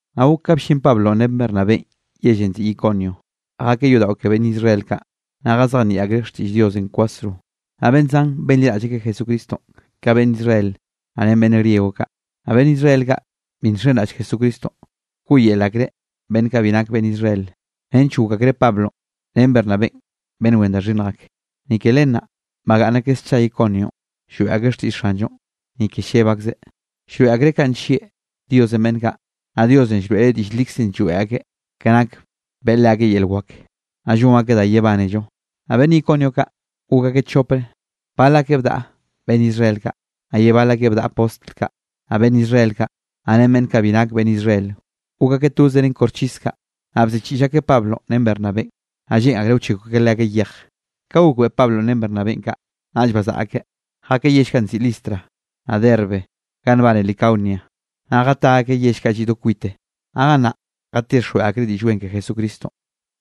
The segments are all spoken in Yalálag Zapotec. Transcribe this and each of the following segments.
Naꞌ gok ka bllin Pablonꞌ ren Bernabénꞌ yellenꞌ nziꞌi Iconio, jakeꞌ yodaꞌo ke beꞌnn Israel kaꞌ. Naꞌ jazejnieꞌ akreꞌ xtiꞌll Diosenꞌ kwasro, naꞌ beꞌnn zan benliraꞌll Jesucristonꞌ ka beꞌnn Israel naꞌ ren beꞌnn griego kaꞌ. Naꞌ beꞌnn Israel kaꞌ bi nxenraꞌll Jesucristonꞌ, bkoꞌyel akreꞌ beꞌnn kaꞌ bi nak beꞌnn Israel, nench gok akreꞌ Pablo ren Bernabénꞌ beꞌnn wen da xhinnj ak. Ni ke len naꞌ bagaꞌnn akeꞌ scha Iconionꞌ, lloeꞌ akeꞌ xtiꞌll Xanllonꞌ, ni ke lleb akzeꞌ, llroeꞌ akreꞌ kanꞌ nllieꞌ Diosenꞌ beꞌnn kaꞌ. Naꞌ Diosenꞌ llroeꞌreꞌ diꞌll likzenꞌ lloeꞌ akeꞌ, ke nak beꞌe leakeꞌ yel wak, naꞌ llon akeꞌ da yebánello. Naꞌ beꞌnn Iconio kaꞌ gok akeꞌ chopre, bal akeꞌ bdaꞌa beꞌnn Israel kaꞌ, naꞌ ye bal akeꞌ bdaꞌa postl kaꞌ. Naꞌ beꞌnn Israel kaꞌ, naꞌ ren beꞌnn kaꞌ bi nak beꞌnn Israel, gok akeꞌ toze ren koxchis kaꞌ, naꞌ bziꞌchiꞌll akeꞌ Pablonꞌ ren Bernabénꞌ, naꞌ lleꞌn akreꞌ wchekw akeꞌ leakeꞌ yej. Ka gokbeꞌe Pablonꞌ ren Bernabénꞌ kaꞌ, naꞌll bazaꞌa akeꞌ jakeꞌ yell kaꞌ nziꞌi Listra, naꞌ Derbe ga nbane Licaonia. Naꞌ jatá akeꞌ yell kaꞌ lliꞌ do kwite, naꞌ gannaꞌ jatixjweꞌ akreꞌ Diꞌll Wen ke Jesucristonꞌ.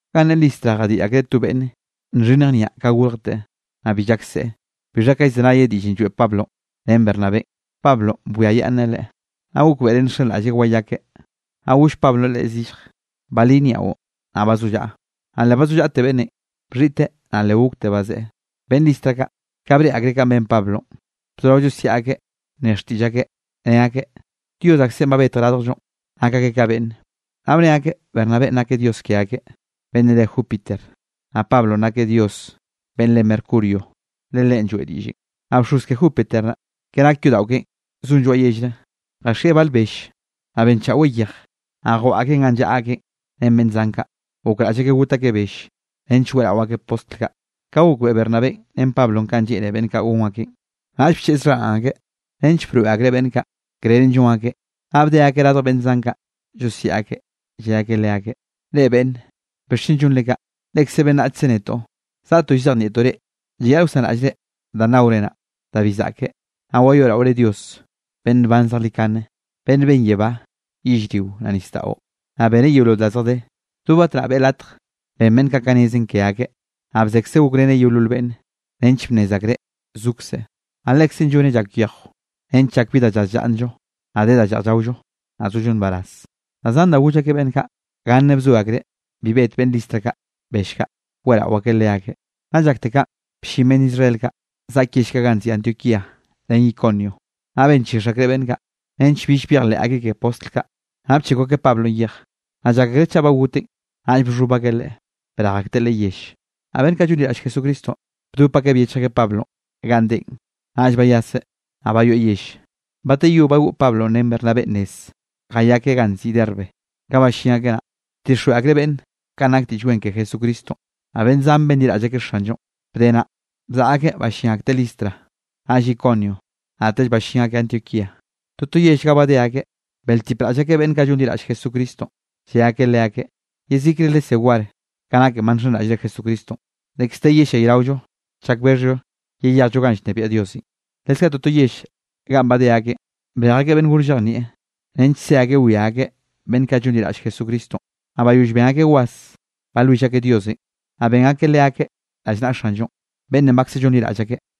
Ganꞌ ne Listra jadiꞌ akreꞌ to beꞌnn nxhinnj niaꞌ ka gorjte, naꞌ bi llak seꞌe. Bixha ka llzenayeꞌ diꞌllenꞌ lloeꞌ Pablonꞌ ren Bernabénꞌ, Pablonꞌ bwiayaꞌnneꞌ leꞌe, naꞌ gokbeꞌreꞌ nxenraꞌlleꞌ wayakeꞌ. Naꞌ goll Pablonꞌ leꞌe zillj: —¡Balí niaꞌon, naꞌ bazollaꞌa! Naꞌ le bazollaꞌte beꞌnnenꞌ, bxhiꞌteꞌ naꞌ le gokte bazeꞌe. Beꞌnn Listra kaꞌ, ka breꞌe akreꞌ kanꞌ ben Pablonꞌ, bzorao llosiaꞌ akeꞌ nne xtiꞌll akeꞌ, ne akeꞌ: —¡Dios aksenꞌ ba betj radjllonꞌ, nak akeꞌ ka beꞌnne! Naꞌ bne akeꞌ Bernabénꞌ nakeꞌ dios ke akeꞌ, beꞌnn re Júpiter, naꞌ Pablonꞌ nakeꞌ dios beꞌnn re Mercurio, le leꞌen lloeꞌ diꞌllenꞌ. Naꞌ bxoz ke Júpiter naꞌ, ke nak yodaꞌo keꞌen zon lloaꞌ yellre, jaxieꞌ bal bell, naꞌ benchaꞌweꞌ yeje, naꞌ jwaꞌa akeꞌn ganꞌ llaꞌa akeꞌ ren beꞌnn zan kaꞌ, gokraꞌll akeꞌ got akeꞌ bell, nench weꞌrao akeꞌ postl kaꞌ. Ka gokbeꞌe Bernabénꞌ ren Pablonꞌ kanꞌ lleꞌne beꞌnn kaꞌ gon akeꞌn, naꞌll bcheꞌz xharaꞌn akeꞌ, nench broeꞌ akreꞌ beꞌnn kaꞌ, krerenꞌ llon akeꞌ, naꞌ bde akeꞌ radj beꞌnn zan kaꞌ llosiaꞌ akeꞌ, lle akeꞌ leakeꞌ: —Reꞌ, beꞌnne, ¿bixchen llonre kaꞌ? Lekze beꞌnnachkze netoꞌ, zaꞌtoꞌ llzejnieꞌtoꞌ reꞌ, llayaꞌl wsanraꞌllre danꞌ naore naꞌ, da bi zaꞌke, naꞌ wayoeꞌraore Dios beꞌnn nban zejlikane, beꞌnn ben yebá, yellrio naꞌ nisdaꞌo, naꞌ beneꞌ yeolol da zjadé. Do batnaꞌ beꞌe latj ben beꞌnn kaꞌ ka nezen ke akeꞌ. Naꞌ bzekzeꞌ gokreneꞌ yeolol beꞌnne, nench bnnez akreꞌ zokzeꞌ, naꞌ Lekzeꞌn lloneꞌ llak yejw nench llak bi da llaz llaꞌnnllo, naꞌ de da lleꞌj llaollo, naꞌ zollo nbaraz. Da zan da goll akeꞌ beꞌnn kaꞌ, ganne bzoe akreꞌ bi bet beꞌnn Listra kaꞌ bell kaꞌ, weꞌrao akeꞌ leakeꞌ. Nna llakte kaꞌn, bllin beꞌnn Israel kaꞌ zaꞌk yell kaꞌ nziꞌi Antioquía ren Iconio, naꞌ benchix akreꞌ beꞌnn kaꞌ, nench bill byejleꞌ akeꞌ ke postl kaꞌ. Naꞌ bchekw akeꞌ Pablonꞌ yej. Naꞌ llak akreꞌ chaꞌ ba goteꞌn, naꞌll bxhob akeꞌ leꞌe brej akteꞌ leꞌe yell. Naꞌ beꞌnn kaꞌ llonliraꞌll Jesucristonꞌ bdop akeꞌ byechj akeꞌ Pablonꞌ ganꞌ deꞌen, naꞌll bayaseꞌ naꞌ bayoeꞌ yell. Bateyó bagoꞌ Pablonꞌ ren Bernabénꞌ nez, jayakeꞌ ganꞌ nziꞌi Derbe. Ka ballín akeꞌ naꞌ, bdixjweꞌ akreꞌ beꞌnne kanꞌ nak Diꞌll Wen ke Jesucristonꞌ, naꞌ beꞌnn zan benliraꞌll akeꞌ Xanllonꞌ. Bde naꞌ, bzaꞌa akeꞌ ballín akteꞌ Listra, naꞌll Iconio, naꞌtell ballín akeꞌ Antioquía. Toto yell ga badé akeꞌ, beꞌltipraꞌll akeꞌ beꞌnn kaꞌ llonliraꞌll Jesucristonꞌ, lle akeꞌ leakeꞌ: —Yezikre lesé war ka naken ba nxenraꞌllre Jesucristonꞌ, dekz de yellayraollo chak bexhllo yeyejllo ganꞌ llnebiaꞌ Diosenꞌ. Leskaꞌ toto yell ganꞌ badé akeꞌn, brej akeꞌ beꞌnn gor llejnieꞌ, nench se akeꞌ wia akeꞌ beꞌnn kaꞌ llonliraꞌll Jesucristonꞌ. Naꞌ bayoll ben akeꞌ was, balwill akeꞌ Diosenꞌ, naꞌ ben akeꞌ leakeꞌ rallnaꞌa Xanllonꞌ, beꞌnnenꞌ bakze llonliraꞌll akeꞌ.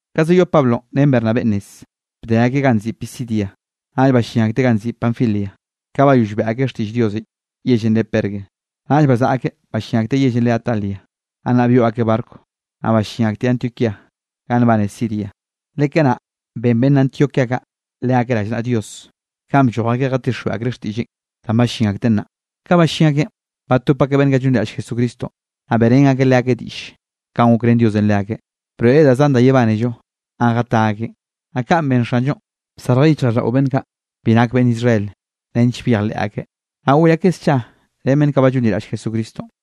Ka zayoꞌ Pablonꞌ ren Bernabénꞌ nezenꞌ, bde akeꞌ ga nziꞌi Pisidia, naꞌll ballín akteꞌ ganꞌ nziꞌi Panfilia. Ka bayoll beꞌe akeꞌ xtiꞌll Diosenꞌ yellenꞌ re Perge, naꞌll bazaꞌa akeꞌ ballín akteꞌ yellenꞌ re Atalia. Gannaꞌ byoꞌ akeꞌ barco, naꞌ ballín akteꞌ Antioquía ganꞌ nbane Siria, le kanaꞌ ben beꞌnn Antioquía kaꞌ leakeꞌ rallnaꞌa Dios, kanꞌ blloj akeꞌ jatixjweꞌ akreꞌ xtiꞌlleꞌn danꞌ ballín akteꞌ naꞌ. Ka ballín akeꞌn, batop akeꞌ beꞌnn kaꞌ llonliraꞌll Jesucristonꞌ, naꞌ beꞌrén akeꞌ leakeꞌ diꞌll kanꞌ gokrén Diosenꞌ leakeꞌ, broeꞌreꞌ da zan da yebánello ganꞌ jatá akeꞌn, naꞌ kanꞌ ben Xanllonꞌ bsarjeꞌ yichjraꞌlldaꞌo beꞌnn kaꞌ bi nak beꞌnn Israel nench byejleꞌ akeꞌ. Naꞌ goꞌy akeꞌ scha ren beꞌnn kaꞌ ba llonliraꞌll Jesucristonꞌ.